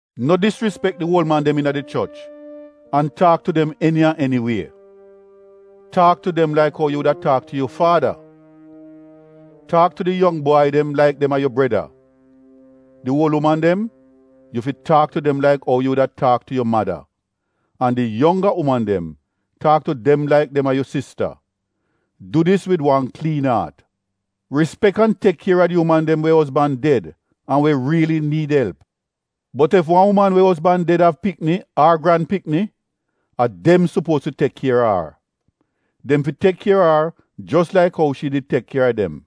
No disrispek di uol man dem iina di choch an taak tu dem eni an eni wie. Taak tu dem laik ou yu wuda taak tu yu faada. Taak tu di yong bwai dem laik dem a yu breda Di uol uman dem, yu fi taak tu dem laik ou yu wuda taak tu yu mada an di yongga uman dem taak tu dem laik dem a yu sista. Du dis wid wan kliin aat. Rispek an tek kier a di uman dem we ozban ded an we riili niid elp. Bot ef wan uman we ozban ded av pikni ar granpikni, a dem sopuoz fi tek kier a ar. Dem fi tek kier a ar jos laik ou shi di tek kier a dem.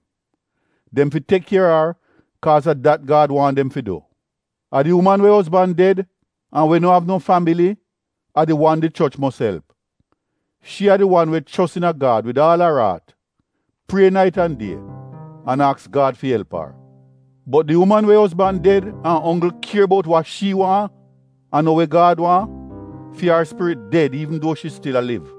Dem fi tek kier a ar kaaz a dat Gad waahn dem fi du. A di uman we ozban ded an we no av no fambili, a di wan di choch mos elp. Shi a di wan we chos iina Gad wid aal ar aat, prie nait an die, an aks Gad fi elp ar. Bot di uman we ozban ded an onggl kier bout wa shi waahn an no we Gad waahn, fi ar spirit ded iivn duo shi stil a liv.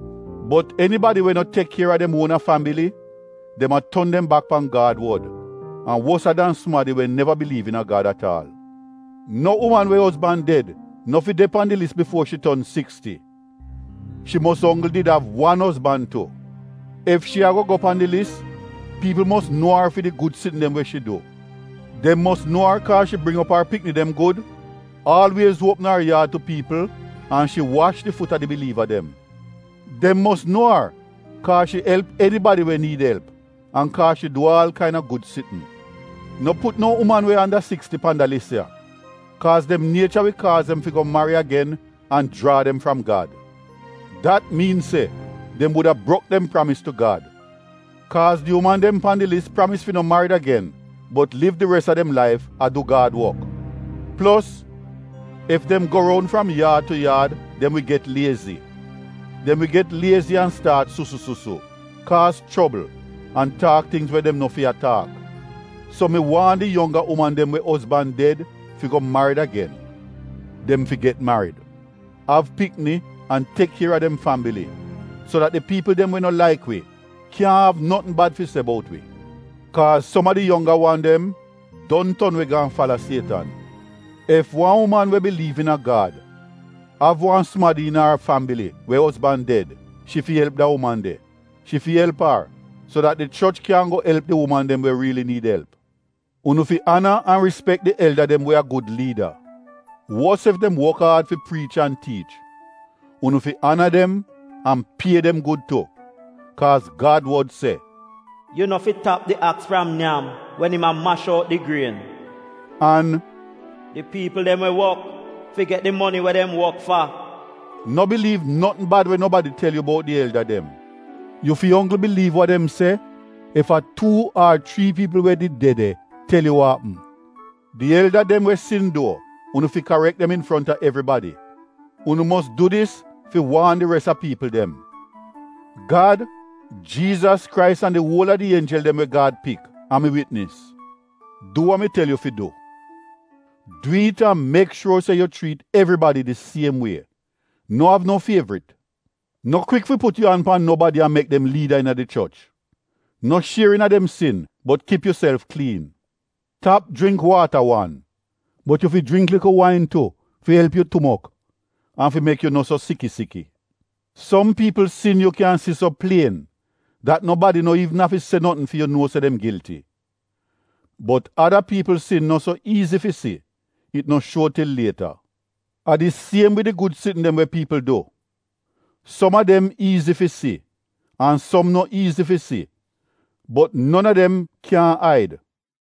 Bot enibadi we no tek kier a dem uona fambili dem a ton dem bak pan Gad wod an wosa dan sumadi we neva biliiv iina Gad at aal. No uman we ozban ded no fi de pan di lis bifuo shi ton siksti. Shi mos onggl did av wan ozban tu. Ef shi ago go pan di lis, piipl mos nuo ar fi di gud sitn dem we shi du. Dem mos nuo ar kaaz shi bring op ar pikni dem gud, aalwiez uopm op ar yaad tu piipl an shi wash di fut a di biliiva dem. Dem mos nuo ar kaaz shi elp enibadi we niid elp an kaaz shi du aal kaina gud sitn. No put no uman we anda siksti pan da lis ya. Kaaz dem niecha wi kaaz dem fi go mari agen an jraa dem fram Gad. Dat miin se dem wuda brok dem pramis tu Gad. Kaaz di uman dem pan di lis pramis fi no marid agen bot liv di res a dem laif a du Gad wok. Plos, ef dem go roun fram yaad tu yaad dem wi get liezi. Dem wi get liezi an staat susu-susu, kaaz chobl, an taak tingz we dem no fi a taak. So mi waahn di yongga uman dem we ozban ded fi go marid agen. Dem fi mari, av pikni an tek kier a dem fambili so dat di piipl dem we no laik wi, kyaahn av notn bad fi se bout wi. Kaaz som a di yongga wan dem don ton we gaan fala Sietan. Ef wan uman we biliiv iina Gad, av wan sumadi iina ar fambili we ozban ded, shi fi elp da uman de. Shi fi elp ar, so dat di choch kyan go elp di uman dem we riili niid elp. Unu fi ana an rispek di elda dem we a gud liida, wos ef dem wok aad fi priich an tiich. Unu fi ana dem an pie dem gud tu. Kaaz Gad wod se, “Yu no fi tap di aks fram nyam wen im a mash out di grien” an “Di piipl dem we wok fi get di moni we dem wok fa.” No biliiv notn bad we nobadi tel yu bout di elda dem anles a tuu ar chrii piipl we did de de tel yu. Di elda dem we sin duo, unu fi karek dem infronta evribadi. Unu mos du dis fi waan di res a piipl dem. Gad, Jiizas Krais an di uol a di ienjel dem we Gad chuuz a mi witnis, du wa mi tel yu fi du. Du it an mek shuor se yu chriit evribadi di siem wie. No av no fievrit. No kwik fi put yu an pan nobadi an mek dem liida iina di choch. No shier iina dem sin bot kip yuself kliin. (Tap jringk waata wan bot yu fi jringk likl wain tu fi elp yu stomok an fi mek yu no so siki-siki). Som piipl sin yu kyan si so plien dat nobadi no iivn afi se notn fi yu nuo se dem gilti. Bot ada piipl sin no so iizi fi si, it no shuo til lieta. A di siem wid di gud sitn dem we piipl du. Som a dem iizi fi si an som no iizi fi si, bot non a dem kyaahn aid.